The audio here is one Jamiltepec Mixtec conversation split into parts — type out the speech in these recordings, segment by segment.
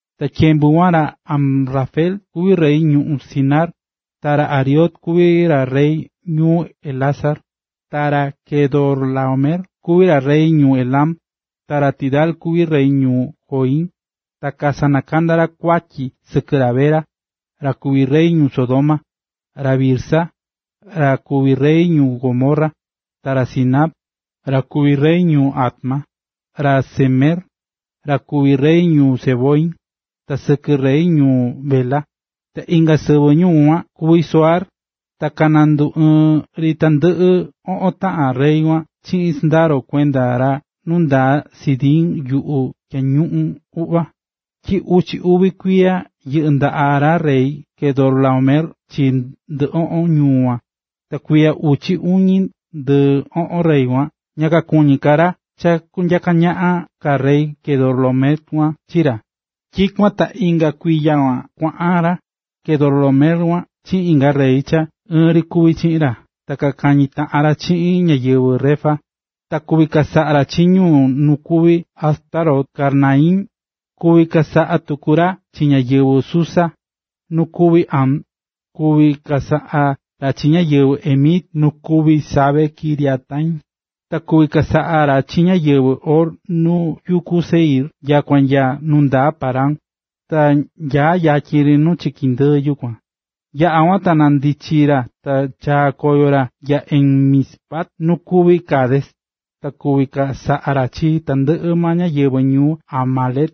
Ta tyembu kuan ra Amrafel kuví rey ñuꞌún Sinar, ta ra Arioc kuví ra rey ñuu Elasar, ta ra Quedorlaomer kuví ra rey ñuu Elam, ta ra Tidal kuví rey ñuu Goim. Ta kasanakanda̱ ra kuatyi sɨkɨ ra Bera, ra kuví rey ñuu Sodoma, ra Birsa, ra kuví rey ñuu Gomorra, ra Sinab, ra kuví rey ñuu Adma, ra Semeber, ra kuví rey ñuu Zeboim, ta sɨkɨ rey ñuu Bela, ta inga sɨvɨ ñuu kuan kuví Zoar. Ta kananduɨɨ́n ri tandɨꞌɨ oꞌon taꞌan rey kuan chiꞌin sɨndaro kuenda ra nundaa Sidim yuꞌu Tyañuꞌun Uꞌva. Tyi uchi uvi kuiya yɨꞌɨ̱ ndaꞌa ra rey Quedorlaomer chi ndɨɨ oꞌon ñuu kuan, ta kuiya uchi uñi ndɨɨ oꞌon rey kuan ña kakuñí ka ra cha kunyaka ñaꞌan ka rey Quedorlaomer kuan chi ra. Tyikuan ta inga kuiya kuan kuaꞌan ra Quedorlaomer chiꞌin inga rey cha ɨɨn ri kuví chiꞌin ra ta kakañí taꞌan ra chiꞌin ñáyɨvɨ Refa, ta kuvi̱ chasaꞌa ra chi ñu nu kuví Astarot Karnaim, kuvi̱ chasaꞌa tuku ra chi ñáyɨvɨ Zusa, nu kuví Ham, kuvi̱ chasaꞌa ra chi ñáyɨvɨ Emit nu kuví Save-kiriataim. Ta kuvi̱ chasaꞌa ra chi ñáyɨvɨ Hor nu yuku Seir nyakua nya nu ndaa Parán, cha nyaá yatyin nu chiki ndɨɨ yukuan. Yaꞌa̱ kuan, ta nandichi̱ ra ta chaa̱ koyo ra nya En-mispat nu kuví Cades. Ta kuvi chasaꞌa ra chi tandɨꞌɨ maa ñáyɨvɨ ñuu Amalec,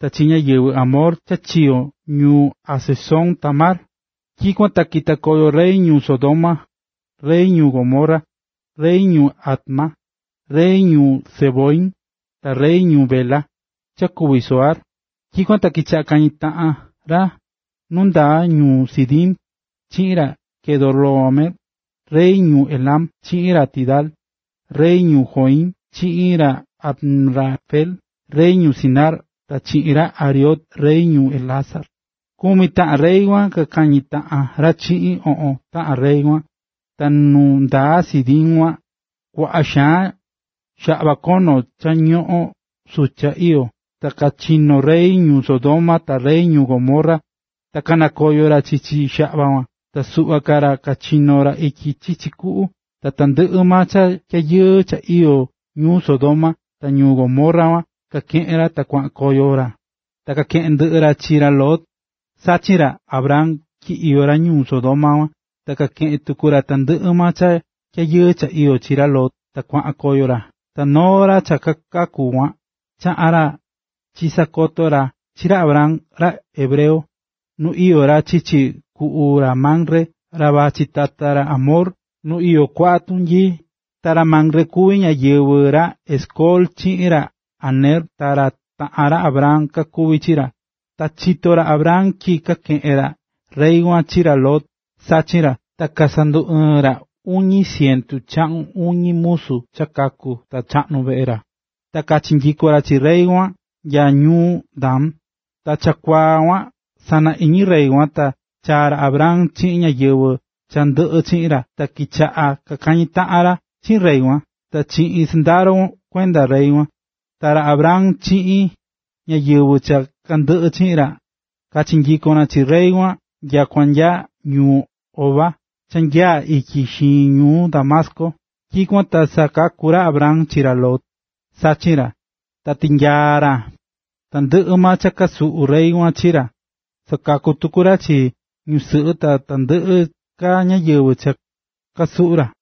ta chi ñáyɨvɨ Amor cha chiyo̱ ñuu Hazezon-tamar. Tyikuan ta kita̱ koyo rey ñuu Sodoma, rey ñuu Gomorra, rey ñuu Adma, rey ñuu Zeboim, ta rey ñuu Bela (cha kuví Zoar). Tyikuan ta kichaꞌa̱ kañí taꞌan ra nu ndaa ñuꞌún Sidim, chiꞌin ra Quedorlaomer, rey ñuu Elam, chiꞌin ra Tidal, rey ñuu Goim, chiꞌin ra Amrafel, rey ñuu Sinar, ta chiꞌin ra Arioc, rey ñuu Elasar. Kumi taꞌan rey kuan kakañi̱ taꞌan ra chiꞌin oꞌon taꞌan rey kuan. Ta nu ndaa Sidim kuan kuaꞌa xaan xaꞌva kono cha ñoꞌón sucha iyó, ta kachino̱ rey ñuu Sodoma ta rey ñuu Gomorra, ta kanakoyo̱ ra chichi xaꞌva kuan. Ta suꞌva ka ra kachinó ra ityi chichi kuꞌu. Ta tandɨꞌɨ maa cha tyayɨɨ cha iyó ñuu Sodoma ta ñuu Gomorra kuan kakeꞌe̱n ra ta kuaꞌan koyo ra. Ta kakeꞌe̱n ndɨꞌɨ ra chi ra Lot, sachin ra Abram, tyi iyó ra ñuu Sodoma kuan, kakeꞌe̱n tuku ra tandɨꞌɨ maa cha tyayɨɨ cha iyó chi ra Lot ta kuaꞌan koyo ra. Ta noo ra cha kaku̱ kuan chaꞌa̱n ra chisakoto̱ ra chi ra Abram, ra hebreo,a nu iyó ra chichi kuꞌu ra Mamre, ra vachí tata ra Amor, nu iyó kuaꞌa tunyii. Ta ra Mamre kuví yañi ra Escol chiꞌin ra Aner, ta ra taꞌán ra Abram kakuví chi ra. Ta chito̱ ra Abram tyi kakeꞌe̱n rey kuan chi ra Lot, sachin ra, ta sanduɨɨ̱n ra uñi cientu chaꞌun uñi musu cha kaku̱ ta cha chaꞌnu̱ veꞌe ra, ta kachinyiko̱n ra chi rey kuan nya ñuu Dan. Ta chakuaa kuan sana iñi rey kuan, ta chaa̱ ra Abram chiꞌin ñáyɨvɨ cha ndɨꞌɨ chiꞌin ra, ta kichaꞌa̱ kakañi̱ taꞌan ra chiꞌin rey kuan ta chiꞌin sɨndaro kuenda rey kuan. Ta ra Abram chiꞌin ñáyɨvɨ cha kandɨꞌɨ chiꞌin ra kachinyiko̱n ra chi rey kuan nyakua nya ñuu Hoba, cha nyaá ityi xiñi ñuu Damasco. Tyikuan ta sakaku̱ ra Abram chi ra Lot, sachin ra, ta tinyaa̱ ra tandɨꞌɨ maa cha kasuꞌu̱ rey kuan chi ra, sakaku̱ tuku ra chi ñusɨꞌɨ ta tandɨꞌɨ ka ñáyɨvɨ cha kasuꞌu̱ ra.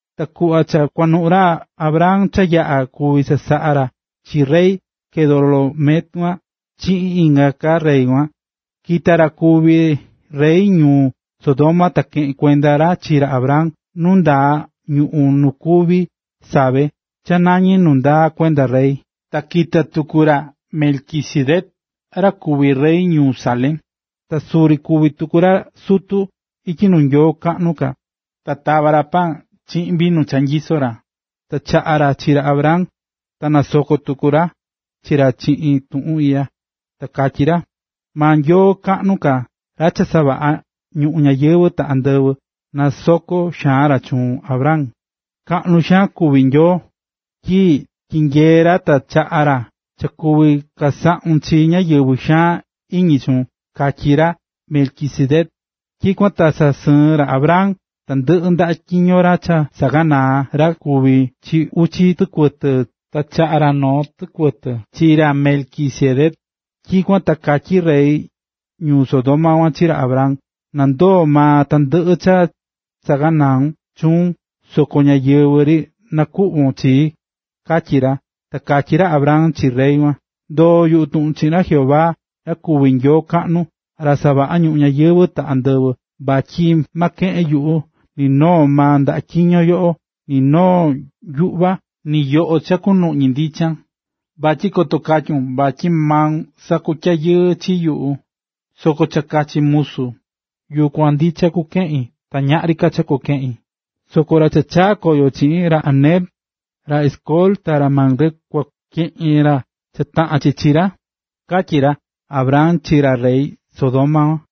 Ta kuꞌva cha kuanuꞌu̱ ra Abram cha yaꞌa̱ kuvi̱ chasaꞌa ra chi rey Quedorlaomer chiꞌin inga ka rey kuan, kita̱ ra kuví rey ñuu Sodoma ta keꞌe̱n kuenda ra chi ra Abram nu ndaa ñuꞌún nu kuví Save, cha nañí nu ndaa kuenda Rey. Ta kita̱ tuku ra Melquisedec ra kuví rey ñuu Salem, ta suri kuví tuku ra sutu ityi nuu Nyoo kaꞌnu ka, ta tava̱ ra paan chiꞌin vinu cha nyisó ra, ta chaꞌa̱ ra chi ra Abram ta nasoko̱ tuku ra chi ra chiꞌin tuꞌun iꞌya, ta katyí ra: “Maa Nyoo kaꞌnu ka, ra cha savaꞌa̱ ñuꞌún ñayɨvɨ̱ ta andɨvɨ, na nasoko xaan ra chuun, Abram. Kaꞌnu xaan kuví Nyoo, tyi tyinyee̱ ra ta chaꞌa̱ ra cha kuvi̱ chasaꞌun chi ñáyɨvɨ xaan iñi chuun”, katyí ra Melquisedec. Tyikuan ta sasɨɨ̱n ra Abram tandɨꞌɨ ndaꞌa tyiño cha saꞌaganaa̱ ra kuví chi uchi tɨkuɨtɨ, ta chaꞌa̱ ra noo tɨkuɨtɨ chi ra Melquisedec. Tyikuan ta katyí rey ñuu Sodoma kuan chi ra Abram: ―Na ndoo maa tandɨꞌɨ ka cha saꞌaganau̱n chuun, soko ñáyɨvɨ ri nakuꞌvo̱n chii ―katyí ra. Ta katyí ra Abram chi rey kuan: ―Ndoo̱ yuꞌu tuꞌun chiꞌin ra Jehová, ra kuví Nyoo kaꞌnu, ra cha savaꞌa̱ ñuꞌún ñayɨvɨ̱ ta andɨvɨ, vatyi ma keꞌen yuꞌu ni noo maa ndaꞌa tyiño yoꞌo, ni noo yuꞌva, ni yoꞌo cha kunuꞌñi ndichan, vatyi koto katyun vatyi maun sakutyayɨɨ chi yuꞌu. Soko cha kachachi̱ musu, yukuan ndicha kukeꞌin, ta ñaꞌri ka cha kukeꞌin. Soko ra cha chaꞌa̱n koyo chiꞌin, ra Aner, ra Escol ta ra Mamre kua keꞌen ra cha taꞌán chi chi ra ―katyí ra Abram chi ra rey Sodoma.